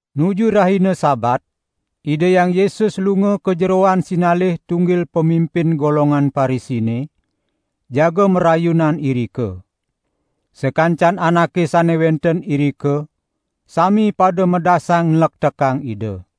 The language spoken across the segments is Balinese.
Nuju rahina Sabat, Ida Hyang Yesus lunga ka jeroan sinalih tunggil pamimpin golongan Parisine, jaga marayunan irika. Sakancan anake sane wenten irika sami pada medasang nlektekang Ida.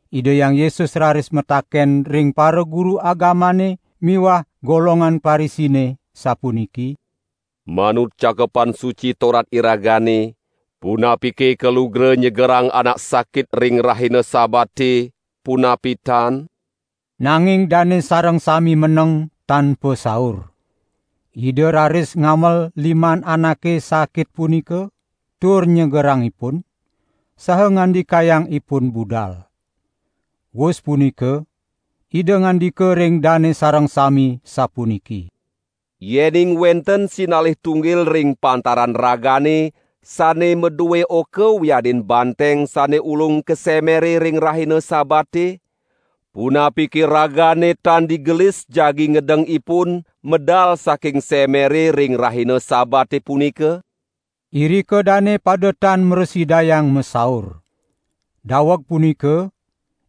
Ida Hyang Yesus raris mataken ring paraguru agamane miwah golongan Parisine, sapuniki: "Manut Cakepan Suci Torat iragane, punapike kalugra nyegerang anak sakit ring rahina Sabate, punapi tan?" Nanging dane sareng sami meneng tan pasaur. Ida raris ngamel liman anake sakit punika tur nyegerang ipun, saha ngandikayang ipun budal. Wus punika Ida ngandika ring dane sareng sami, sapuniki: "Yening wenten sinalih tunggil ring pantaran ragane sane madue oka wiadin banteng sane ulung ka semere ring rahina Sabate, punapike ragane tan digelis jagi ngedeng ipun medal saking semere ring rahina Sabate punika?" Irika dane pada tan mrasidayang masaur. Daweg punika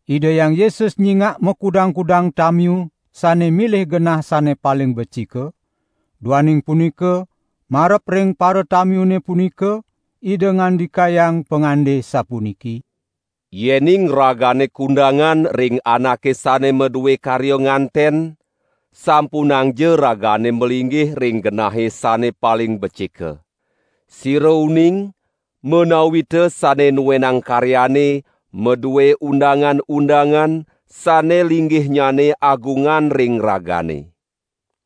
Ida Hyang Yesus nyingak makudang-kudang tamiu sane milih genah sane paling becika, duaning punika marep ring paratamiune punika Ida ngandikayang pangande sapuniki: "Yening ragane kundangan ring anake sane madue karya nganten, sampunangja ragane malinggih ring genahe sane paling becika. Sira uning, menawita sane nuenang karyane madue undang-undangan sane linggihnyane agungan ring ragane.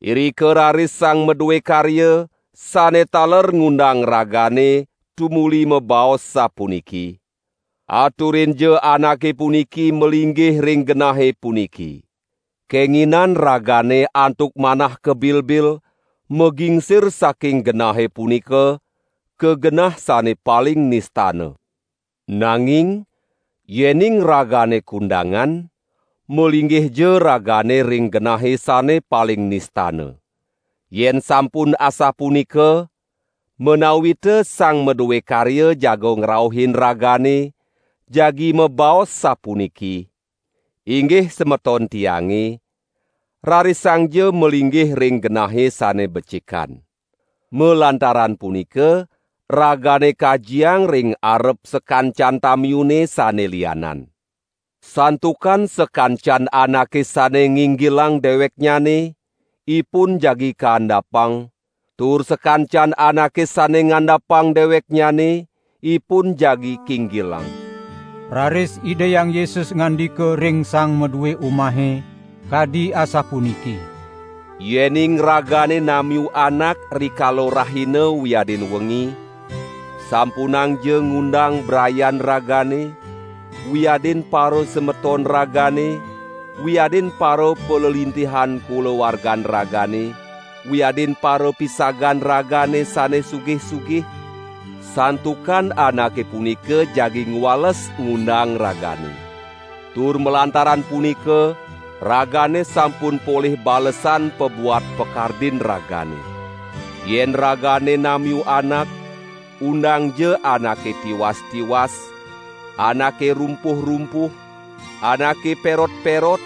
Irika raris sang madue karya, sane taler ngundang ragane tumuli mabaos sapuniki: 'Aturinja anake puniki malinggih ring genahe puniki.' Kenginan ragane antuk manah kebilbil magingsir saking genahe punika ka genah sane paling nistana. Nanging yening ragane kundangan, malinggihja ragane ring genahe sane paling nistana. Yen sampun asapunika, menawita sang madue karya jaga ngrauhin ragane, jagi mabaos sapuniki: 'Inggih semeton tiange, rarisangja malinggih ring genahe sane becikan.' Malantaran punika ragane kajiang ring arep sakancan tamiune sane lianan. Santukan sakancan anake sane nginggilang deweknyane, ipun jagi kaandapang, tur sakancan anake sane ngandapang deweknyane, ipun jagi kinggilang." Raris Ida Hyang Yesus ngandika ring sang madue umahe, kadi asapuniki: "Yening ragane namiu anak rikala rahina wiadin wengi, sampunangja ngundang brayan ragane, wiadin parasemeton ragane, wiadin parapalelintihan kulawargan ragane, wiadin parapisagan ragane sane sugih-sugih, santukan anake punika jagi ngwales ngundang ragane. Tur malantaran punika ragane sampun polih balesan pabuat pakardin ragane. Yen ragane namiu anak, undangja anake tiwas-tiwas, anake rumpuh-rumpuh, anake perot-perot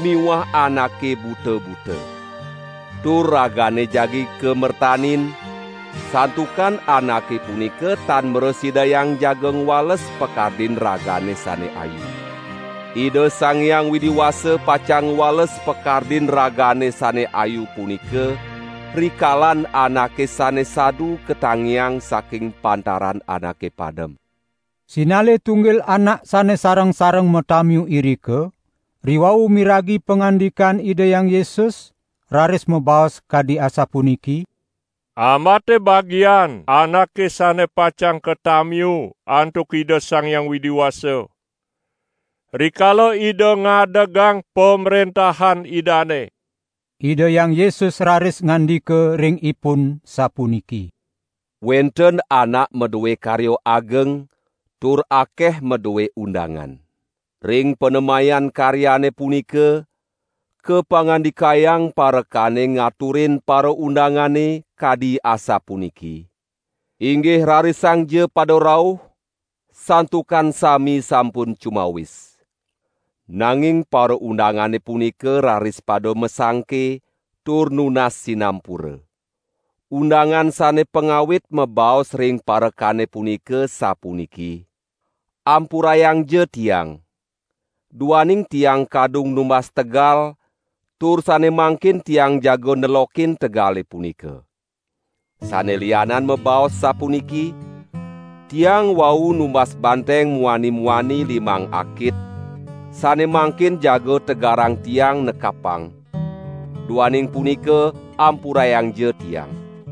miwah anake buta-buta. Tur ragane jagi kamertanin, santukan anake punika tan mrasidayang jaga ngwales pakardin ragane sane ayu. Ida Sang Hyang Widi Wasa pacang ngwales pakardin ragane sane ayu punika, rikalan anake sane sadu katangiang saking pantaran anake padem." Sinalih tunggil anak sane sareng-sareng matamiu irika, riwau miragi pangandikan Ida Hyang Yesus raris mabaos kadi asapuniki: "Ambate bagian anake sane pacang katamiu antuk Ida Sang Hyang Widi Wasa, rikala Ida ngadegang Pamrentahan Idane!" Ida Hyang Yesus raris ngandika ring ipun sapuniki: "Wenten anak madue karya ageng tur akeh madue undangan. Ring panemayan karyane punika, kapangandikayang parekane ngaturin paraundangane, kadi asapuniki: 'Inggih rarisangja pada rauh, santukan sami sampun cumawis!' Nanging paraundangane punika raris pada masangke, tur nunas sinampura. Undangan sane pangawit mabaos ring parekane punika sapuniki: 'Ampurayangja tiang, duaning tiang kadung numbas tegal, tur sane mangkin tiang jaga nelokin tegale punika.' Sane lianan mabaos sapuniki: 'Tiang wau numbas banteng muani-muani limang akit, sane mangkin jaga tegarang tiang nekapang; duaning punika ampurayangja tiang.'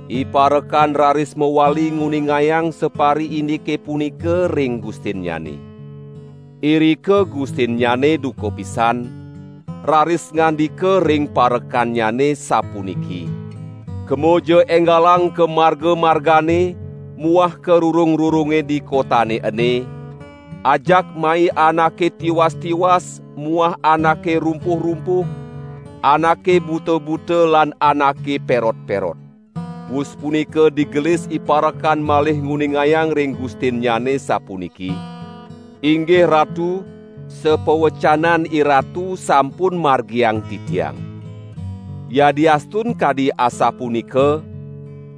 Iparekan raris mawali nguningayang sapariindike punika ring gustinnyane. Irika gustinnyane duka pisan, raris ngandika ring parekannyane, sapuniki: 'Kemaja enggalang ka marga-margane muah ka rurung-rurunge di kotane ene, ajak mai anake tiwas-tiwas muah anake rumpuh-rumpuh, anake buta-buta lan anake perot-perot.' Wus punika digelis iparekan malih nguningayang ring gustinnyane sapuniki: 'Inggih ratu, sapawacanan iratu sampun margiang titiang. Yadiastun kadi asapunika,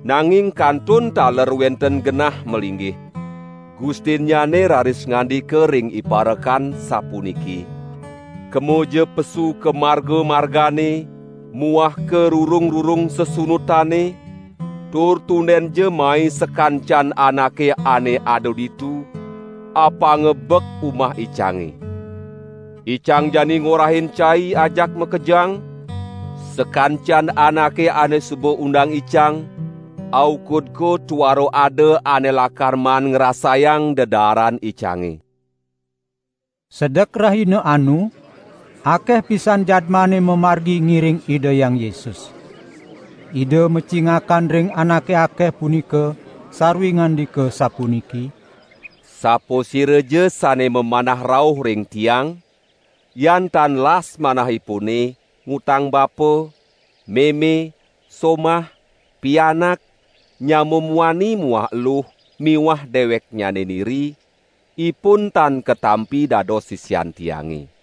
nanging kantun taler wenten genah malinggih.' Gustinnyane raris ngandika ring iparekan, sapuniki: 'Kemaja pesu ka marga-margane muah ka rurung-rurung sesunutane, tur tundenja mai sakancan anake ane ada ditu, apanga bek umah icange. Icang jani ngorahin cai ajak makejang, sakancan anake ane suba undang icang, aukud ko tuara ada ane lakar maan ngrasayang dedaaran icange.'" Sedek rahina anu akeh pisan jadmane mamargi ngiring Ida Hyang Yesus. Ida macingakan ring anake akeh punika, sarwi ngandika sapuniki: "Sapasiraja sane mamanah rauh ring Tiang, yan tan las manahipune ngutang bapa, meme, somah, pianak, nyama muani muah eluh miwah deweknyane niri, ipun tan katampi dados sisian Tiange.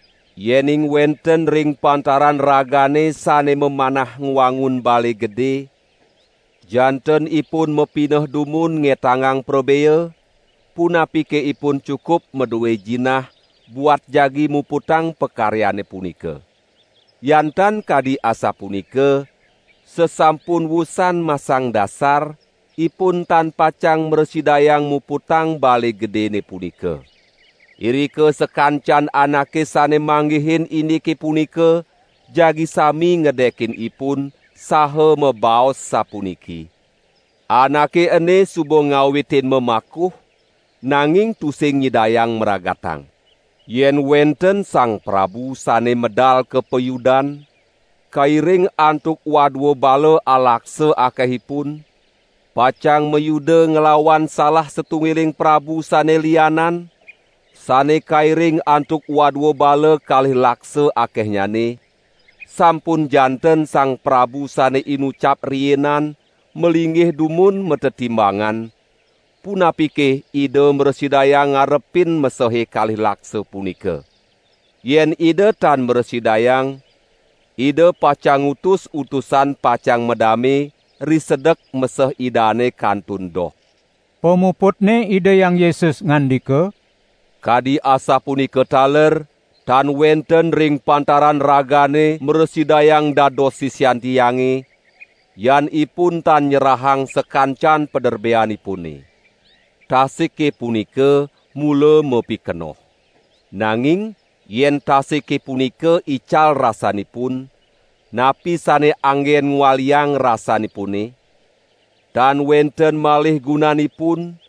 Yening wenten ring pantaran ragane sane mamanah ngwangun bale gede, janten ipun mapineh dumun ngetangang prabea, punapike ipun cukup madue jinah buat jagi muputang pakaryane punika. Yan tan kadi asapunika, sasampun wusan masang dasar, ipun tan pacang mrasidayang muputang bale gedene punika. Irika sakancan anake sane manggihin indike punika, jagi sami ngedekin ipun, saha mabaos sapuniki: 'Anake ene suba ngawitin mamakuh, nanging tusing nyidayang mragatang.' Yen wenten sang prabu sane medal ka payudan, kairing antuk wadua bala alaksa akehipun, pacang mayuda nglawan salah satunggiling prabu sane lianan, sane kairing antuk wadua bala kalih laksa akehnyane, sampun janten sang prabu sane inucap riinan malinggih dumun matetimbangan, punapike ida mrasidayang ngarepin mesehe kalih laksa punika. Yen ida tan mrasidayang, ida pacang ngutus utusan pacang madame risedek meseh idane kantun doh." Pamuputne Ida Hyang Yesus ngandika: "Kadi asapunika taler tan wenten ring pantaran ragane mrasidayang dados sisian Tiange, yan ipun tan nyerahang sakancan paderbeanipune." "Tasike punika mula mapikenoh. Nanging yen tasike punika ical rasanipun, napi sane anggen ngwaliang rasanipune? Tan wenten malih gunanipun,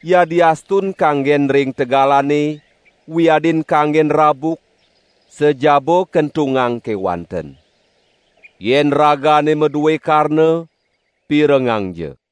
yadiastun kanggen ring tegalane, wiadin kanggen rabuk, sajaba kentungang kewanten. Yen ragane madue karna, pirengangja!"